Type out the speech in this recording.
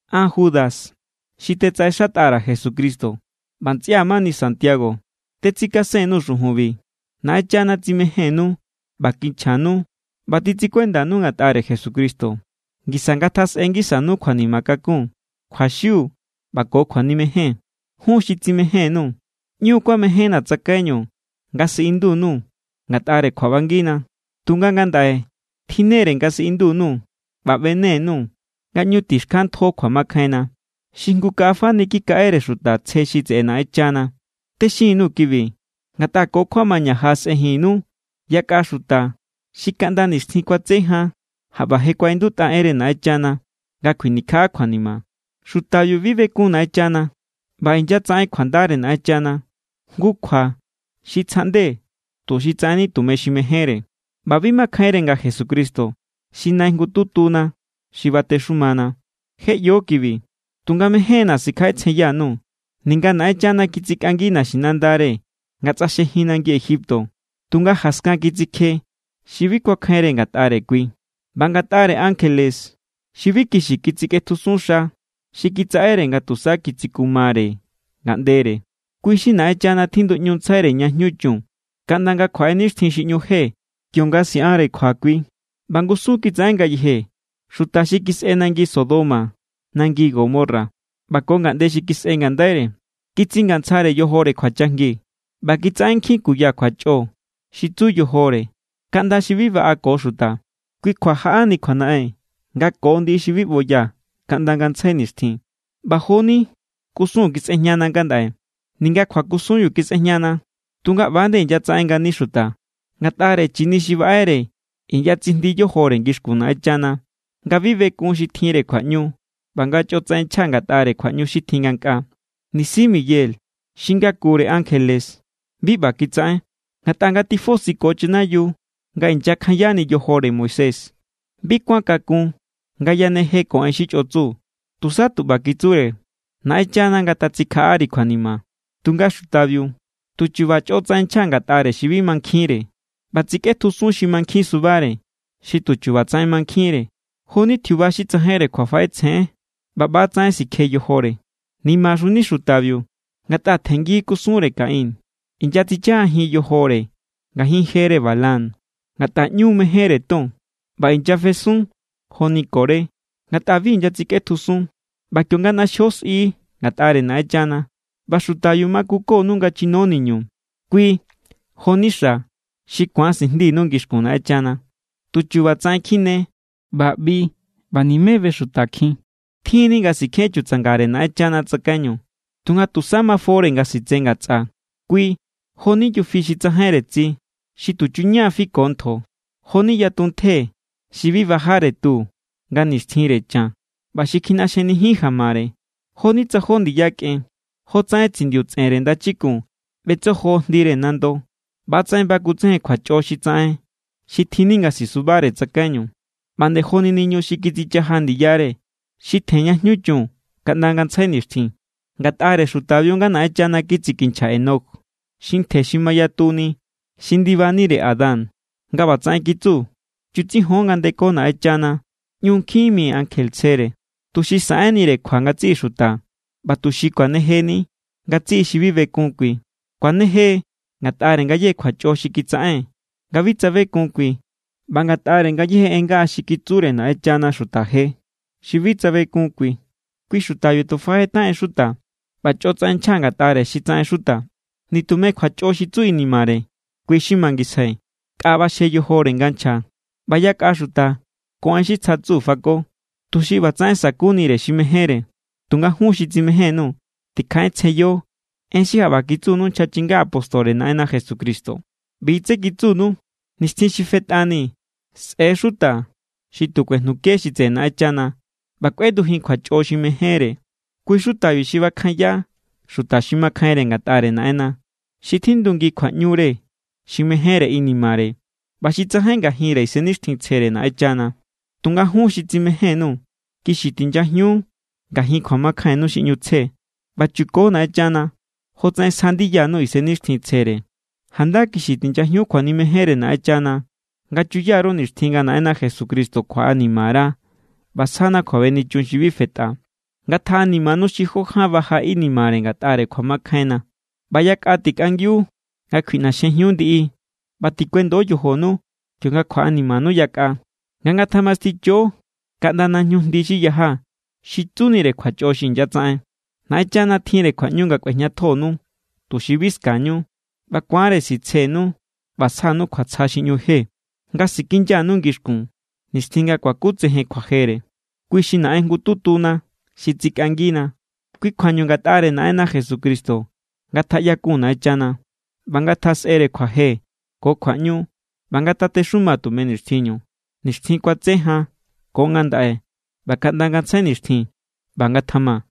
An, Judas, xi tetsaꞌexatꞌa_ra̱ Jesucristo ꞌba ntsꞌia̱ mani Santiago, tetsikasen_nuu̱ xujunbi. Naꞌenchana tsimejénnu ꞌba kinchjanu ꞌba titsikuendanu ngatꞌare Jesucristo. Ngisa ngatjasꞌe ngisanu kjuanima kakun, kjuaxiu ꞌba ko kjuanimejen. Jun xi tsimején_nuu̱, ꞌñu kuamejénna̱ tsakaiñu nga siꞌindu_nuu̱ ngatꞌare kjuaꞌbangina. Tunga ngandaꞌe tjinnere nga siꞌindu_nuu̱ ꞌba ꞌbene_nuu̱ nga ꞌñu tixkjanntjo kjuamakjainna, xi jngu kaꞌa fani kikaꞌere xuta tsje xi tseꞌe Naꞌenchana. Texin_nuu̱ kibi ngatꞌa ko kjuamaña jaꞌasꞌenjinnu yakꞌa xuta xi kaꞌnda nixtjin kuatse jan jaꞌba je kuaꞌindutꞌa enre Naꞌenchana nga kjuinikjaꞌa kjuanima. Xutabiu bi bekun Naꞌenchana ꞌba inyatsaꞌen kjuandare Naꞌenchana jngu kjua xi tsjaꞌnde tuxi tsaꞌenni tume xi mejénre. ꞌBa bi makjainre nga Jesucristo xi Nai jngututuna xi batexumana. Je ꞌyo kibi, tunga mején=na̱ sikjaꞌetsjenyanu. Ninga Naꞌenchana kitsikꞌangi naxinandare nga tsꞌaxjejin nangi Egipto, tunga jaskan kitsikje xi bi kuakjainre ngatꞌare kui. ꞌBa ngatꞌare ankjele xi bi kixi kitsikꞌetjusun xa xi kitsaꞌere nga tusa kitsikumare ngaꞌndere, kui xi Naꞌenchana tjinduꞌñuntsjaire ña jñu chun kaꞌnda nga kjuaꞌe nixtjin xi ꞌñu je kionga siꞌanre kjua kui. ꞌBa ngusun kitsaꞌen ngayeje xuta xi kisꞌe nangi Sodoma, nangi Gomorra ꞌba ko ngaꞌnde xi kisꞌe ngandaire. Kitsingantsjare yojore kjuachajngi ꞌba kitsaꞌen nkjin kuya kjuachꞌo xi tsu yojore kaꞌnda xi bi baꞌa ko xuta. Kui kjua jaꞌani kjuanaꞌen nga ko ndiꞌi xi bi ꞌboya kaꞌnda ngantsjai nixtjin, ꞌba jo=ni kusun kisꞌejñana ngandaꞌe. Ninga kjuakusunbiu kisꞌejñana, tunga ꞌba=nde inyatsaꞌen ngani xutabiu. Ngatꞌare chini xi baꞌere inyatsijndi yojore ngixkun Naꞌenchana nga bi bekun xi tjinre kjuaꞌñu ꞌba nga chꞌotsaꞌen nchja ngatꞌare kjuaꞌñu xi tjin ngankꞌaa. Nisi Miguel xi ngakure ankjele bi ꞌba kitsaꞌen. Ngatꞌa nga tifosiko chanayiu nga inyakjayani yojore Moisés, bi kuan kakun nga yaneje ko en xi chꞌotsu. Tusa tu ꞌba kitsure: “¡Naꞌenchana ngatatsikjaꞌari kjuanima!” Tunga xutabiu, tuchuba chꞌotsaꞌen nchja ngatꞌare xi bi mankjinre. ꞌBa, tsikꞌetjusun xi mankjinsubare, xi tuchuba tsaꞌen mankjinre, joni tjiuba xi tsajain kjuafaꞌetsjeénre, ꞌba ꞌba=tsaꞌen sikje yojore. ¡Nimaxuni xutabiu!, ngatꞌa tjenngi kusunre Caín. Inyatsichajajin yojore ngajin jere Balaam, ngatꞌa ꞌñu= mejénre ton. ꞌBa inyafesun= joni Coré, ngatꞌa bi inyatsikꞌetjusun. ꞌBa kionga ꞌnaxjio sꞌi ngatꞌare Naꞌenchana, ꞌba xutabiu makukonu nga chino niñu, kui jo=ni xa̱ xi ku̱an sijndinu ngixkun Naꞌenchana. Tu chubatsaꞌen kjine ꞌba ꞌbi ꞌba nimé bexutakjin. Tjin=ni nga sikjen chutsangare Naꞌenchana tsakaiñu, tunga tusa mafore nga sitse ngatsꞌa. Kui jo=ni yufi xi tsajainre tsi, xi tuchu=ña fiko ntjo. Jo=ni yatuntje xi bi bajare tu nga nixtjinre chan ꞌba xi kjiꞌnaxjenijin jamare, joni tsa jó ndiya kꞌen. Jotsaꞌen tsindiu tsꞌenre ndachikun ꞌbetsojo jndire nando, ꞌba=tsaꞌen bakutsejen kjuachꞌo xi tsaꞌen xi tjinni nga sisubare tsakaiñu. ꞌBa nde joni niñu xi kitsichaja ndiyare, xi tjen ña ꞌñu jñu chun kaꞌnda ngantsjai nixtjin. Ngatꞌare xutabiu= nga Naꞌenchana kitsikinchja Enoc, xi ntje xi mayatuni xi ndibanire Adán, nga ꞌbatsaꞌen kitsu: “Chutsijon nga ndeko Naꞌenchana ꞌñu nkjin mi ankje tsjere, tuxi saꞌenire kjua ngatsiꞌi xuta ꞌba tuxi kuanejeni ngatsiꞌi xi bi bekun kui. Kuaneje ngatꞌare ngayéje kjuachꞌo xi kitsaꞌen nga bi tsabekun kui ꞌba ngatꞌare ngayéje en ngaꞌa xi kitsure Naꞌenchana xuta je xi bi tsabekun kui.” Kui xutabiu tu fajetaꞌen xuta ꞌba chꞌotsaꞌen nchja ngatꞌare xi tsaꞌen xuta. Nitume kjuachꞌo xi tsu inimare, kui= xi mangisjai. Nkꞌa ꞌbaxje yojore nga nchja, ꞌba yakꞌa xuta ko en xi tsja tsu fako, tuxi ꞌbatsaꞌen sa̱kunire xi mejénre. Tunga jun xi tsimején_nuu̱, tikjaꞌetsjenyo en xi jaꞌba kitsunu nchja chinga apóstore Naꞌenna Jesucristo. ꞌBi= tsé kitsunu: “Nixtjin xi je tifetꞌani sꞌe̱= xuta xi tu kuejnuke= xi tseꞌe Naꞌenchana ꞌba kꞌuendujin kjuachꞌo xi mejénre.” Kui= xutabiu xi bakjanya xuta xi makjainre ngatꞌare Naꞌenna, xi tjindu ngi kjuaꞌñure xi mejénre inimare ꞌba xi tsajain ngajinre Isennixtjintsjere Naꞌenchana. Tunga jun xi tsimején_nuu̱, kixi tinyajiun ngajin kjuamakjainnu xi ꞌñu tsje ꞌba chuko Naꞌenchana jotsaꞌen sja ndiyanu Isennixtjintsjere. Janda kixi tinyajiun kjuanimejenre Naꞌenchana nga chuya_ru nixtjin nga Naꞌenna Jesucristo kjuaꞌanima_ra ꞌba sjana kjuabenichun xi bi fetꞌa. Ngatjaꞌanimanu xi jó ján baja inimare ngatꞌare kjuamakjainna. ꞌBa yakꞌa tikꞌangiu nga kjuiꞌnaxjejiun ndiꞌi. ꞌBa tikuendo yojonu kionga kjaꞌanimanu yakꞌa nga ngatjamasticho kaꞌnda najñu jndi xi yaja, xi tsunire kjuachꞌo xi inyatsaꞌen. Naꞌenchana tjinre kjuaꞌñu nga kꞌuejñatjonu, tuxi bi ska̱ñu. ꞌBa ku̱anre sitsjenu ꞌba sjanu kjuatsja xi ꞌñu je, nga sikinyanu ngixkun nixtjin nga kuakutsejen kjuajere. Kui xi Naꞌen jngututuna xi tsikꞌangina. Kui kjuañu ngatꞌare Naꞌenna Jesucristo ngatjaꞌyakun Naꞌenchana, ꞌba ngatjasꞌere kjuaje ko kjuaꞌñu ꞌba ngatatexuma tume nixtjinñu, nixtjin kuatse jan ko ngandaꞌe ꞌba kaꞌnda ngantsjai nixtjin. ꞌBa ngatjama.